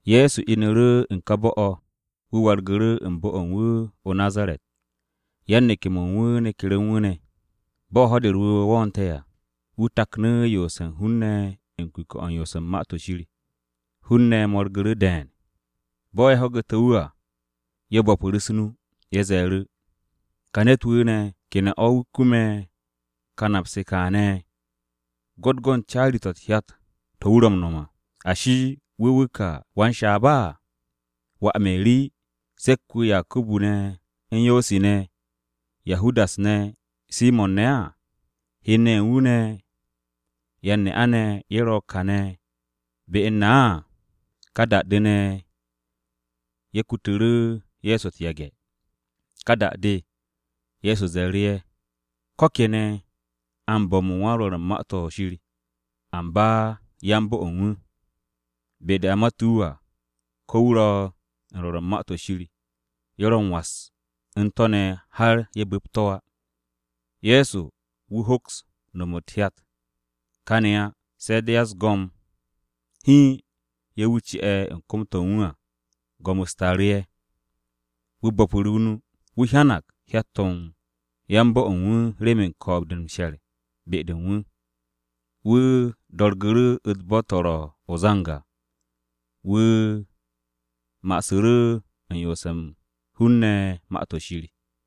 Ye̱so inu̱ru̱ u̱n ka bo̱-o̱, wu̱ wargu̱ru̱ u̱n bo̱-o̱ u̱n wu̱ o-Nazaret. Yan-neke̱-mo̱ u̱n wu̱ neku̱ru̱ u̱n wu̱ ne̱. Bo̱ Ho̱-de u̱r-Wu̱we̱ wo̱o̱nte̱ à, wu̱ taknu̱ yoose̱ u̱n hun-ne̱ u̱n kuke̱-o̱ u̱n yoos u̱n Ma-to̱ Shir. Hun-ne̱ mo̱rgu̱ru̱ de̱e̱n. Bo̱ ye̱ ho̱gu̱te̱ wu̱ à, ye̱ bo̱pu̱ru̱ u̱s-nu. Ye̱ ze̱e̱ru̱, “Ka ne̱t-wu̱ ne̱, ¿ke ne̱ o̱ wu̱ kume̱ ka nap-se kaane̱? Gwo̱t go̱n caari-to̱ u̱t-hyat to̱ wu̱ ro̱ m-no̱m à! Ashi, ¿wu̱ wu̱ ka wan-shaab? ¿Wà Meri, se̱k-wu̱ Yakubu ne̱ u̱n Yosi ne̱, Yahudas ne̱, Simo̱n ne̱? Hen-ne̱ ye̱ u̱n wu̱ ne̱, yan-ne'a-ne̱ ye̱ ro̱ ko̱n kane̱ be u̱n na.” Ka da-de ne̱, ye̱ kutu̱ru̱ Ye̱so u̱t-yage̱. Ka da-de, Ye̱so ze̱e̱ru̱ ye̱, “Ko̱ kene̱ a m-bo̱m u̱n wan-rwo̱r u̱n Ma-to̱ Shir, amba yan-bo̱-o̱ u̱n wu̱, be-de a mate̱ wu̱ à, ko̱ wu̱ ro̱ u̱n rwo̱r u̱n Ma-to̱ Shir, ye̱ ro̱ m-was u̱n to̱ ne̱ har ye̱ bu̱pt to̱ á.” Ye̱so wu̱ hoks no̱m u̱t-hyat kane̱ á, se̱ de̱ ya-u̱s-go̱m hiin ye̱ wu̱ ci'e̱ u̱n kom-to̱ u̱n wu̱ à, go̱m-u̱s taaru̱ ye̱. Wu̱ bo̱pu̱ru̱ nu. Wu̱ hyanag hyat-to̱ u̱n yan-bo̱-o̱ u̱n wu̱ remen ko̱o̱b-de u̱n m-she̱r be-de u̱n wu̱. Wu̱ do̱rgu̱ru̱ u̱t-bo̱ to̱ ro̱ o-zang à. Wu̱ masu̱ru̱ u̱n yoose̱ u̱n hun-ne̱ Ma-to̱ Shir.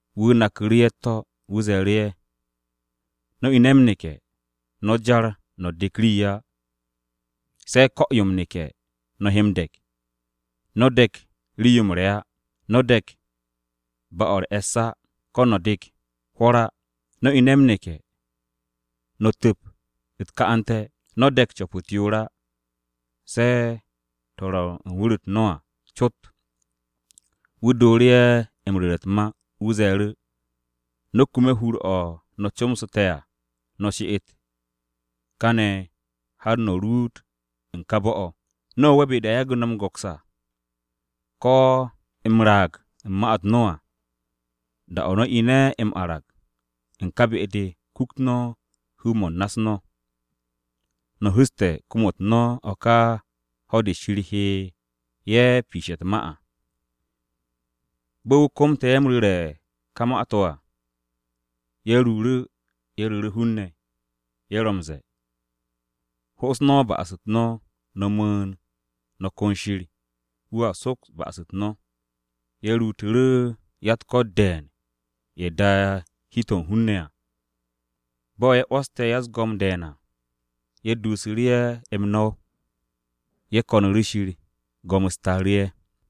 Wu̱ naku̱ru̱ ye̱ u̱t-to̱, wu̱ ze̱e̱ru̱ ye̱, “No̱ ine̱ m-neke̱, no̱ jar no̱ dek rii á, se̱ ko̱-yo m-neke̱, no̱ he m-de̱k. No̱ de̱k rii-yo m-re̱ á. No̱ de̱k ba-o̱ u̱r-e̱ss á. No̱ de̱k hwo̱r á. No̱ ine̱ m-neke̱, no̱ tu̱p u̱t-ka'ante̱. No̱ de̱k co̱p-u̱t yoor á se̱ to̱ ro̱ u̱n wu̱r-u̱t no̱ à cot.” Wu̱ dooru̱ ye̱ m-ru̱re̱ u̱t-ma. Wu̱ ze̱e̱ru̱, “No̱ kume̱ hur-o̱ no̱ comsu̱te̱ à, she'et no̱ kane̱ har no̱ ruut u̱n ka bo̱-o̱. No̱ wo'e̱ be-de a yage̱ no̱ m-go̱ks à, ko̱ m-raag u̱n ma-u̱t no̱ ne̱ à. Da-o̱ no̱ ine̱ m-arag u̱n ka be-de, kukt no̱ hu-mo̱ u̱n na-u̱s no̱. No̱ hu̱ste̱ kom-u̱t no̱ o̱ ka ho̱-de Shir he ye̱ piishe̱ u̱t-ma à.” Bo̱ wu̱ komte̱ ye̱ m-ru̱re̱ u̱n ka ma-to̱ à, ye̱ ruuru̱, ye̱ ru̱ru̱ hun-ne̱. Ye̱ ro m-ze̱e̱, “Ho'os no̱ ba'as-u̱t no̱, no̱ mu̱u̱n, no̱ kon Shir. Wu̱a soks ba'as-u̱t no̱.” Ye̱ ruutu̱ru̱ ya-u̱t-ko̱t de̱e̱n ye̱ da'e̱ hi-to̱ u̱n hun-ne̱ à. Bo̱ ye̱ 'wo̱ste̱ ya-u̱s-go̱m de̱e̱n à, ye̱ duusu̱ru̱ ye̱ m-no̱w. Ye̱ ko̱nu̱ru̱ Shir. Go̱m-u̱s taaru̱ ye̱.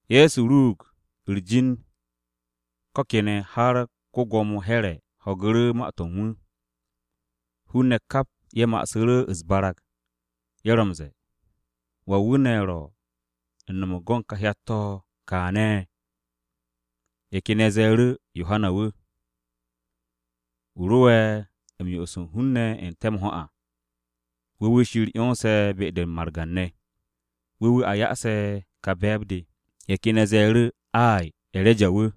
Ye̱so ruug u̱r-jin ko̱ kene̱ har ko-Gwo̱mo Here̱ [Atipas] ho̱gu̱ru̱ ma-to̱ u̱n wu̱. Hun-ne̱ kap ye̱ ma'asu̱ru̱ u̱s-barag. Ye̱ ro m-ze̱e̱, “¿Wan wu̱ ne̱ ro̱ u̱n no̱m u̱n ka hyat-to̱ kaane̱?” Ye̱ ken ye̱ ze̱e̱ru̱ “Yohana wu̱. Wu̱ ro'e̱ u̱n m-yo'os u̱n hun-ne̱ n-te̱ m-ho̱ à. Wu̱ wu̱ Shir 'yonse̱ be-de m-margan ne̱. Wu̱ wu̱ a ya'ase̱ ka be̱e̱b-de.” Ye̱ ken ye̱ ze̱e̱ru̱, “Ay, E̱reja wu̱.”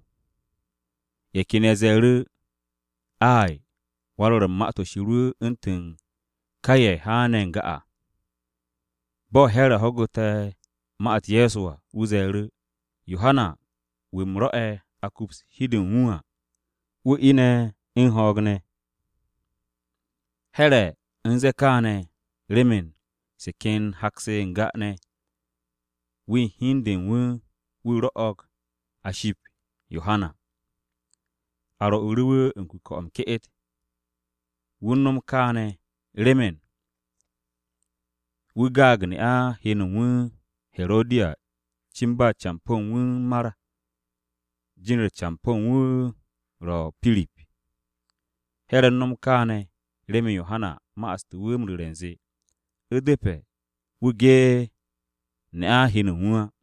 Ye̱ ken ye̱ ze̱e̱ru̱, “Ay, wan-rwo̱r u̱n Ma-to̱ Shir wu̱ u̱ntu̱n ka ye̱ haane̱ n-ga à.” Bo̱ Here̱ ho̱gu̱te̱ ma-u̱t Ye̱so à, wu̱ ze̱e̱ru̱, “Yohana wu̱ u̱m rwo̱'e̱ a kups hi-de u̱n wu̱ à, wu̱ ine̱ u̱n ho̱o̱g ne̱!” Here̱ u̱n ze̱e̱ kááne̱ remen se ken hak-se n-ga ne̱, wu̱ u̱n hi u̱n de u̱n wu̱, wu̱ rwo̱'o̱g a ship Yohana. A rwo̱'u̱ru̱ wu̱ u̱n kuke̱-o̱ m-ke'et. Wu̱ u̱n no̱m kaane̱ remen wu̱ gaag ne'a hen u̱n wu̱, Herodiya cin ba campo̱ u̱n wu̱ u̱n mar. Jin-u̱r campo̱ u̱n wu̱ ro Pirip. Here̱ u̱n no̱m kaane̱ remen Yohana ma'aste̱ wu̱ m-ru̱re̱ u̱nze, u̱depe̱ wu̱ ge ne'a hen u̱n wu̱ á.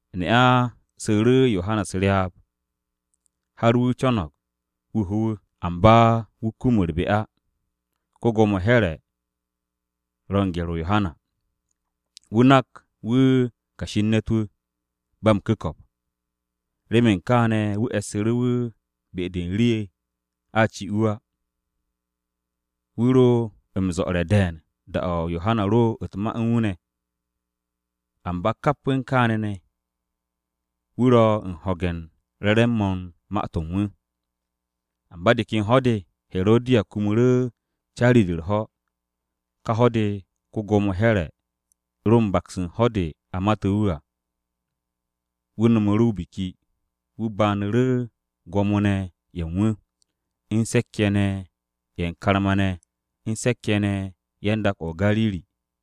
Ne'a su̱u̱ru̱ Yohana u̱s-ryaab har wu̱ co̱no̱g wu̱ ho wu̱. Amba Herodiya kum u̱r-be á. Ko-Gwo̱mo Here̱ ro̱ u̱n gye̱r-o Yohana. Wu̱ nak wu̱ kashi u̱n ne̱t-wu̱, wan-ba-m-ku̱ko̱p. Remen kaane̱, wu̱ e̱ssu̱ru̱ wu̱ be-de rii a ci wu̱ á. Wu̱ ro m-zo̱'o̱re̱ de̱e̱n da-o̱ Yohana ro u̱t-ma u̱n wu̱ ne̱. Amba kap u̱n kaane̱ ne̱, wu̱ ro̱ u̱n ho̱ge̱ u̱n re̱re̱m-mo̱ u̱n ma-to̱ u̱n wu̱. Amba de ken ho̱-de, Herodiya kumu̱ru̱ caari-de u̱r-ho̱. Ka ho̱-de, ko-Gwo̱mo Here̱ ro u̱n baks u̱n ho̱-de a mate̱ wu̱ à. Wu̱ no̱mu̱ru̱ o-biki. Wu̱ banu̱ru̱ gwo̱mo-ne̱ ye̱ u̱n wu̱, u̱n se̱k-ye̱ ne̱ ye̱ u̱n karma-ne̱ u̱n se̱k-ye̱ ne̱ ye̱ u̱n dak-o̱ o-Gariri.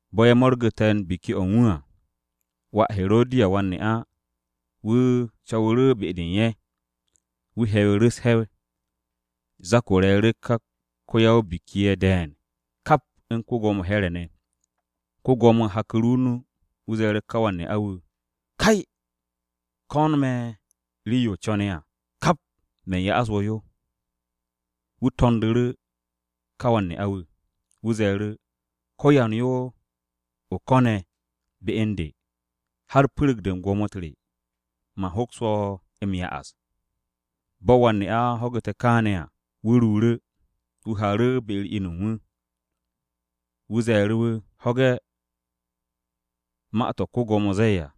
Bo̱ ye̱ mo̱rgu̱te̱ u̱n biki-o̱ u̱n wu̱ à, wà Herodiya wan-ne'a, wu̱ co̱wu̱ru̱ be-de u̱n ye̱. Wu̱ he̱wu̱ru̱ u̱s-he̱w. Zak-o re̱e̱ru̱ ka ya-o-biki ye̱ de̱e̱n, kap u̱n ko-Gwo̱mo Here̱ ne̱. Ko-Gwo̱mo haku̱ru̱ o-nu, wu̱ ze̱e̱ru̱ ká wan-ne'a-wu̱ “Kay, ko̱n me̱ rii-yo o co̱ne̱ à, kap man ya'as wo̱ yo.” Wu̱ to̱ndu̱ru̱ ka wan-ne'a-wu̱. Wu̱ ze̱e̱ru̱, “Ko̱yan yo o ko̱ne̱ be u̱n de, har pu̱ru̱g-de u̱n gwo̱mo-u̱t re, man hoks wo̱ m-ya'as.” Bo̱ wan-ne'a ho̱gu̱te̱ kaane̱ à, wu̱ ruuru̱, wu̱ haaru̱ be-u̱r inu u̱n wu̱. Wu̱ ze̱e̱ru̱ wu̱, “Ho̱ge̱ ma-to̱ ko-Gwo̱mo zee à,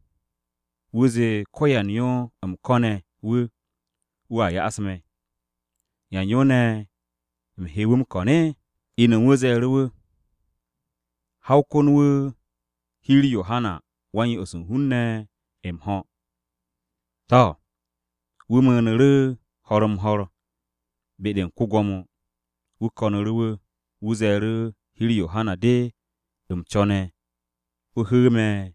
wu̱ zee ko̱yan yo u̱m ko̱ne̱ wu̱, wu̱a ya'as me̱. ¿Yan yo ne̱ u̱m he wu̱ m-ko̱n?” Inu u̱n wu̱ ze̱e̱ru̱ wu̱, “Ha o kon wu̱ hi-u̱r Yohana Wa-m-Yo'os u̱n hun-ne̱ m-ho̱.” To̱, wu̱ mu̱u̱nu̱ru̱, ho̱r-m-ho̱r be-de u̱n ko-Gwo̱mo. Wu̱ ko̱nu̱ru̱ wu̱, wu̱ ze̱e̱ru̱, “Hi-u̱r Yohana Wa-m-Yo'os de u̱m co̱ne̱ o hu̱u̱ me̱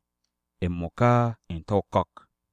m-mo̱ka n-me̱ o-ko̱k.”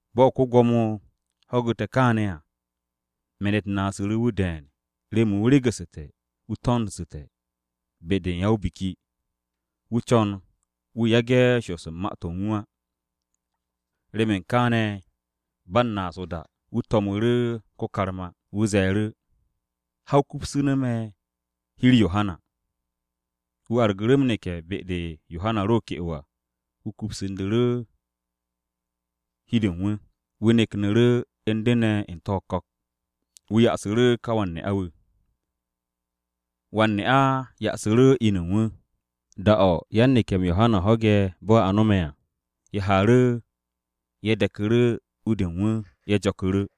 Bo̱ ko-Gwo̱mo ho̱gu̱te̱ kaane̱ à, me̱n-u̱t naasu̱ru̱ wu̱ de̱e̱n remen wu̱ regu̱su̱te̱ wu̱ to̱ndsu̱te̱ be-de u̱n ya-o-biki. Wu̱ co̱n wu̱ yage̱ shoos u̱n ma-to̱ u̱n wu̱ á. Remen kaane̱, ba u̱n naas o-da, wu̱ to̱mu̱ru̱ ko-karma. Wu̱ ze̱e̱ru̱, “Ha o kupsu̱nu̱ me̱ hi-u̱r Yohana.” Wu̱ argu̱ru̱ m-neke̱ be-de Yohana ro ke'o à, wu̱ kupsu̱ru̱ hi-de u̱n wu̱. Wu̱ neknu̱ru̱ u̱n de ne̱ n-me̱ o-ko̱k. Wu̱ ya'asu̱ru̱ ka wan-ne'a-wu̱. Wan-ne'a ya'asu̱ru̱ inu u̱n wu̱. Da-o̱ yan-neke̱-m Yohana ho̱ge̱ bo̱ a no̱me̱ à, ye̱ haaru̱, ye̱ de̱ku̱ru̱ u-de u̱n wu̱, ye̱ jo̱ku̱ru̱.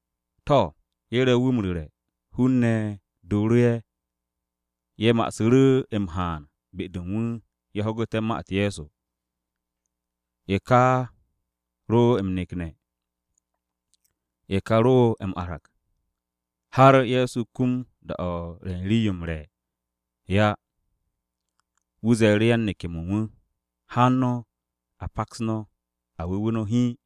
To̱, ye̱ ro wu̱ m-ru̱re̱, hun-ne̱ doro ye̱, ye̱ ma'asu̱ru̱ m-haan be-de u̱n wu̱ ye̱ ho̱gu̱té̱ ma-u̱t Ye̱so. Ye̱ ka ro̱ m-nekne̱, ye̱ ka ro m-arag, har Ye̱so kum da-o̱ u̱n re̱ u̱n rii-yo m-re̱ á. Wu̱ ze̱e̱ru̱ yan-neke̱-mo̱ u̱n wu̱, “Haan no̱, a paks no̱, a wu̱we̱ no̱ hiin.”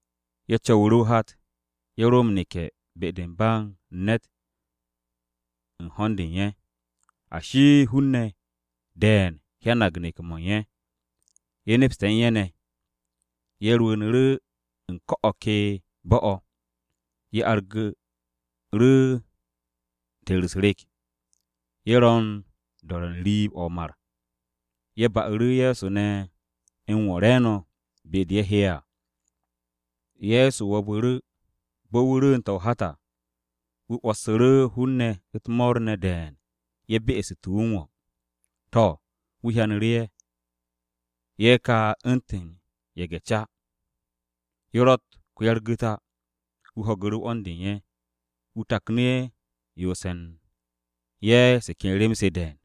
Ye̱ co̱wu̱ru̱ o-hat, ye̱ ro m-neke̱ be-de u̱n ba u̱n ne̱t u̱n ho̱n-de u̱n ye̱. Ashi, hun-ne̱ de̱e̱n hyanag neke̱-mo̱ u̱n ye̱. Ye̱ nepste̱ u̱n ye̱ ne̱. Ye̱ rwu̱u̱nu̱ru̱ u̱n ko̱ o̱ ke bo̱-o̱. Ye̱ argu̱ru̱ teeru̱ u̱s-rek. Ye̱ ro̱ u̱n do̱re̱ n-riib o̱ o-mar. Ye̱ ba'u̱ru̱ Ye̱so ne̱ m-wo̱ re̱e̱no̱ be-de ye̱ he'e̱ à. Ye̱so wo̱bu̱ru̱. Bo̱ wu̱ rwu̱u̱nte̱ o-hat à, wu̱ 'wo̱ssu̱ru̱ hun-ne̱ u̱t-mo̱o̱r ne̱ de̱e̱n ye̱ be'este̱ wu̱ m-wo̱. To̱, wu̱ hyanu̱ru̱ ye̱. Ye̱ ka u̱ntu̱n ye̱ge̱-ca. Ye̱ rotte̱ ko-ya-u̱r-gu̱t á. Wu̱ ho̱gu̱ru̱ 'wo̱n-de u̱n ye̱. Wu̱ taknu̱ yoose̱ u̱n ye̱ se ken rem-se de̱e̱n.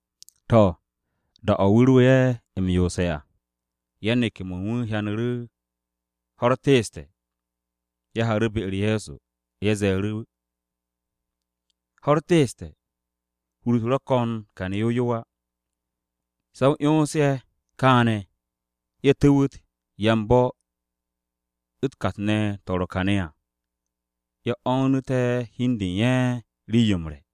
To̱, da-o̱ wu̱ ro ye̱ m-yoose̱ à, yan-neke̱-mo̱ u̱n wu̱ hyanu̱ru̱ ho̱-u̱r teeste̱. Ye̱ haaru̱ be-u̱r Ye̱so. Ye̱ ze̱e̱ru̱, “Ho̱-u̱r teeste̱. Hur-u̱t ro̱ ko̱n kane̱ yow yow á. Se̱ o 'yons ye̱ kaane̱ ye̱ tu̱wu̱t yan-bo̱-u̱t kat-ne̱ to̱ ro̱ kane̱ à, ye̱ oonu̱té̱ hi u̱n de u̱n ye̱ rii-yo m-re̱.”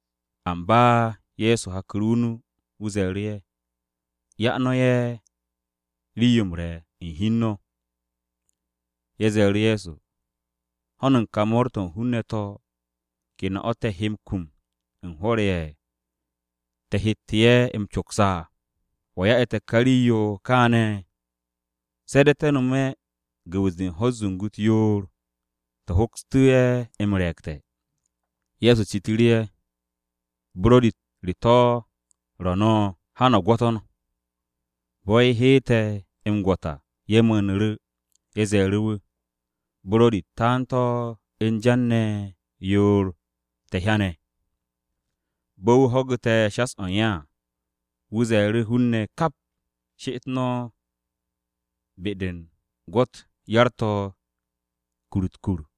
Amba Ye̱so haku̱ru̱ o-nu, wu̱ ze̱e̱ru̱ ye̱, “Ya no̱ ye̱ rii-yo m-re̱ u̱n hi u̱n no̱.” Ye̱ ze̱e̱ru̱ Ye̱so, “Ho̱n u̱n ka mo̱o̱r-to̱ u̱n hun-ne̱ to̱, ¿ke ne̱ o̱ te̱ he kum u̱n hwo̱r-ye̱ te̱ hette̱ ye̱ m-coks à? ¿Wa ya'e̱ te̱ ka rii-yo kaane̱? Se̱ de̱ te̱ nome̱ gu̱wu̱s-de u̱t-ho̱ zungu-u̱s yoor te̱ hokstu̱ ye̱ m-re̱e̱gte̱.” Ye̱so citu̱ru̱ ye̱, “¿Buro̱di-u̱t re to̱ ro̱ no̱? Ha no̱ no̱ gwo̱to̱n.” Bo̱ ye̱ heete̱ m-gwo̱t à ye̱ mu̱u̱nu̱ru̱. Ye̱ ze̱e̱ru̱ wu̱, “Buro̱di-u̱t taan u̱n jan ne̱ yoor te̱ hyane̱.” Bo̱ wu̱ ho̱gu̱te̱ shas-o̱ u̱n ye̱ à, wu̱ ze̱e̱ru̱ hun-ne̱ kap, “She'et no̱ be-de u̱n gwo̱-u̱t yar-to̱ kur-u̱t u̱t-kur.”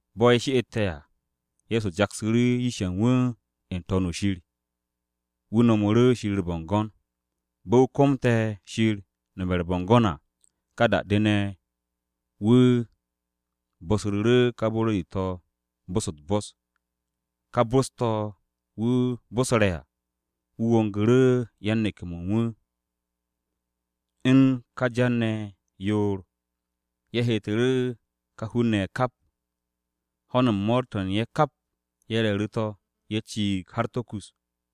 Bo̱ ye̱ she'ette̱ à, Ye̱so jaksu̱ru̱ yish-ye̱ u̱n wu̱ n-To̱n o̱ shir, wu̱ nomu̱ru̱ Shir u̱r-bo̱ngo̱n. Bo̱ wu̱ komte̱ Shir nome̱ u̱r-bo̱ngo̱n à, ka da-de ne̱, wu̱ bosru̱ru̱ ka buro̱di-to̱ bos-u̱t u̱t-bos. Ka bos-to̱ wu̱ bosre̱ à, wu̱ wongu̱ru̱ yan-neke̱-mo̱ u̱n wu̱ u̱n ka jan-ye̱ ne̱ yoor. Ye̱ heetu̱ru̱ ka hun-ne̱ ye̱ kap. Ho̱n u̱n mo̱o̱r-to̱ u̱n ye̱ kap ye̱ re̱e̱ru̱ to̱, ye̱ ciig har to̱ kus,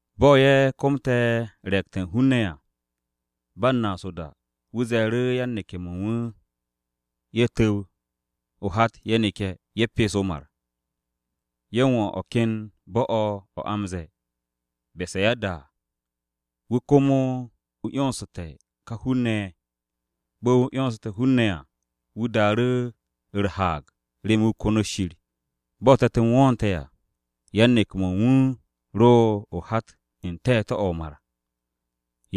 Bo̱ Ye̱so komte̱ re̱e̱gte̱ u̱n hun-ne̱ à, ba u̱n naas o-da, wu̱ ze̱e̱ru̱ yan-neke̱-mo̱ u̱n wu̱ ye̱ tu̱w o-hat ye̱ neke̱, ye̱ pes o-mar, ye̱ wo u̱n o̱ ken bo̱-o̱ o̱ a m-ze̱e̱ o-Besayada. Wu̱ komo wu̱ 'yonsu̱te̱ ka hun-ne̱ ye̱. Bo̱ wu̱ 'yonste̱ hun-ne̱ à, wu̱ daaru̱ u̱r-haag remen wu̱ konot Shir. Bo̱ te̱t-m wo̱o̱nte̱ à, yan-neke̱-mo̱ u̱n wu̱ ro o-hat n-te̱te̱ o̱ o-mar.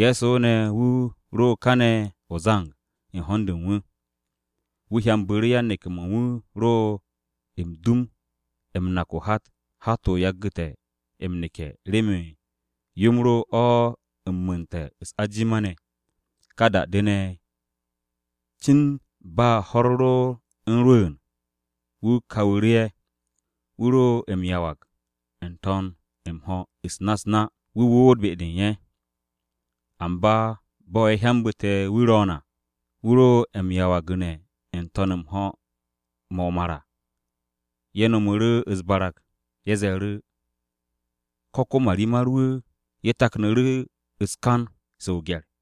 Ye̱so ne̱ wu̱ ro kane̱ o-zang u̱n ho̱n-de u̱n wu̱. Wu̱ hyambu̱ru̱ yan-neke̱-mo̱ u̱n wu̱ ro dum-o m-nak o-hat. Hat-o yagu̱te̱ m-neke̱ remen yo-m ro o̱ m-mu̱u̱nte̱ u̱s-ajima ne̱. Ka da-de ne̱, cin ba ho̱-u̱r ro̱ u̱n rwu̱u̱n, wu̱ kawu̱ru̱ ye̱. Wu̱ ro m-yawag n-to̱n m-ho̱ u̱s-na u̱s-na. Wu̱ woot be-de u̱n ye̱. Amba bo̱ ye̱ hyambu̱te̱ wu̱ ro̱o̱n à, wu̱ ro m-yawgu̱ne̱ n-to̱n m-ho̱ mo̱ o-mar, ye̱ no̱mu̱ru̱ u̱s-barag. Ye̱ ze̱e̱ru̱, “¿Ko̱ ko-marimar-wu̱?” Ye̱ taknu̱ru̱ u̱s-kan se o-gye̱r.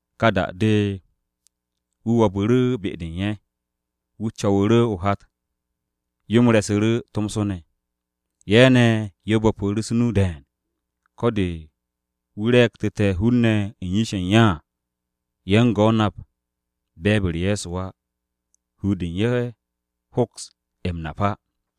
Ka da-de, wu̱ wo̱bu̱ru̱ be-de u̱n ye̱. Wu̱ co̱wu̱ru̱ o-hat. Yo-m re̱su̱ru̱ tomso ne̱. Ye̱ ne̱ ye̱ bo̱pu̱ru̱ u̱s-nu de̱e̱n. Ko̱ de̱ wu̱ re̱e̱gtu̱te̱ hun-ne̱ u̱n yish-ye̱ u̱n ye̱ à, ye̱ u̱ngo̱ nap be̱e̱b-u̱r Ye̱so á. Hur-de u̱n ye̱ hoks m-nap á.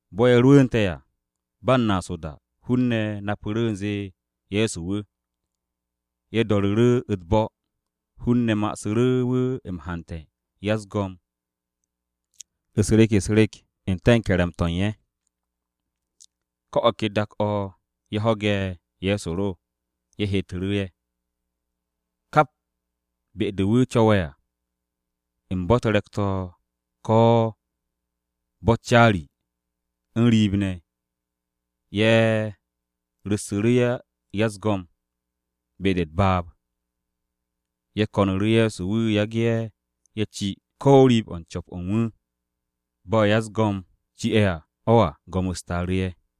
Bo̱ ye̱ rwu̱u̱nte̱ à, ba u̱n naas o-da, hun-ne̱ napu̱ru̱ u̱nze Ye̱so wu̱. Ye̱ do̱ru̱ru̱ u̱t-bo̱, hun-ne̱ masu̱ru̱ wu̱ m-hante̱ ya-u̱s-go̱m u̱s-rek u̱s-rek n-te̱ u̱n ke̱re̱m-to̱ u̱n ye̱. Ko̱ o̱ ke dak-o̱ ye̱ ho̱ge̱ Ye̱so ro, ye̱ heetu̱ru̱ ye̱. Kap be-de wu̱ co̱we̱ à, u̱n bo̱-u̱t re̱k-to̱ ko̱ bo̱-u̱t caari, u̱n riib ne̱, ye̱ ru̱ssu̱ru̱ ya-u̱s-go̱m be-de u̱t-baab. Ye̱ ko̱nu̱ru̱ Ye̱so wu̱ yage̱ ye̱ ci ko̱ riib-o̱ u̱n co̱p-o̱ u̱n wu̱. Bo̱ u̱n ya-u̱s-go̱m ye̱ ci'e̱ o̱ à, go̱m-u̱s taaru̱ ye̱.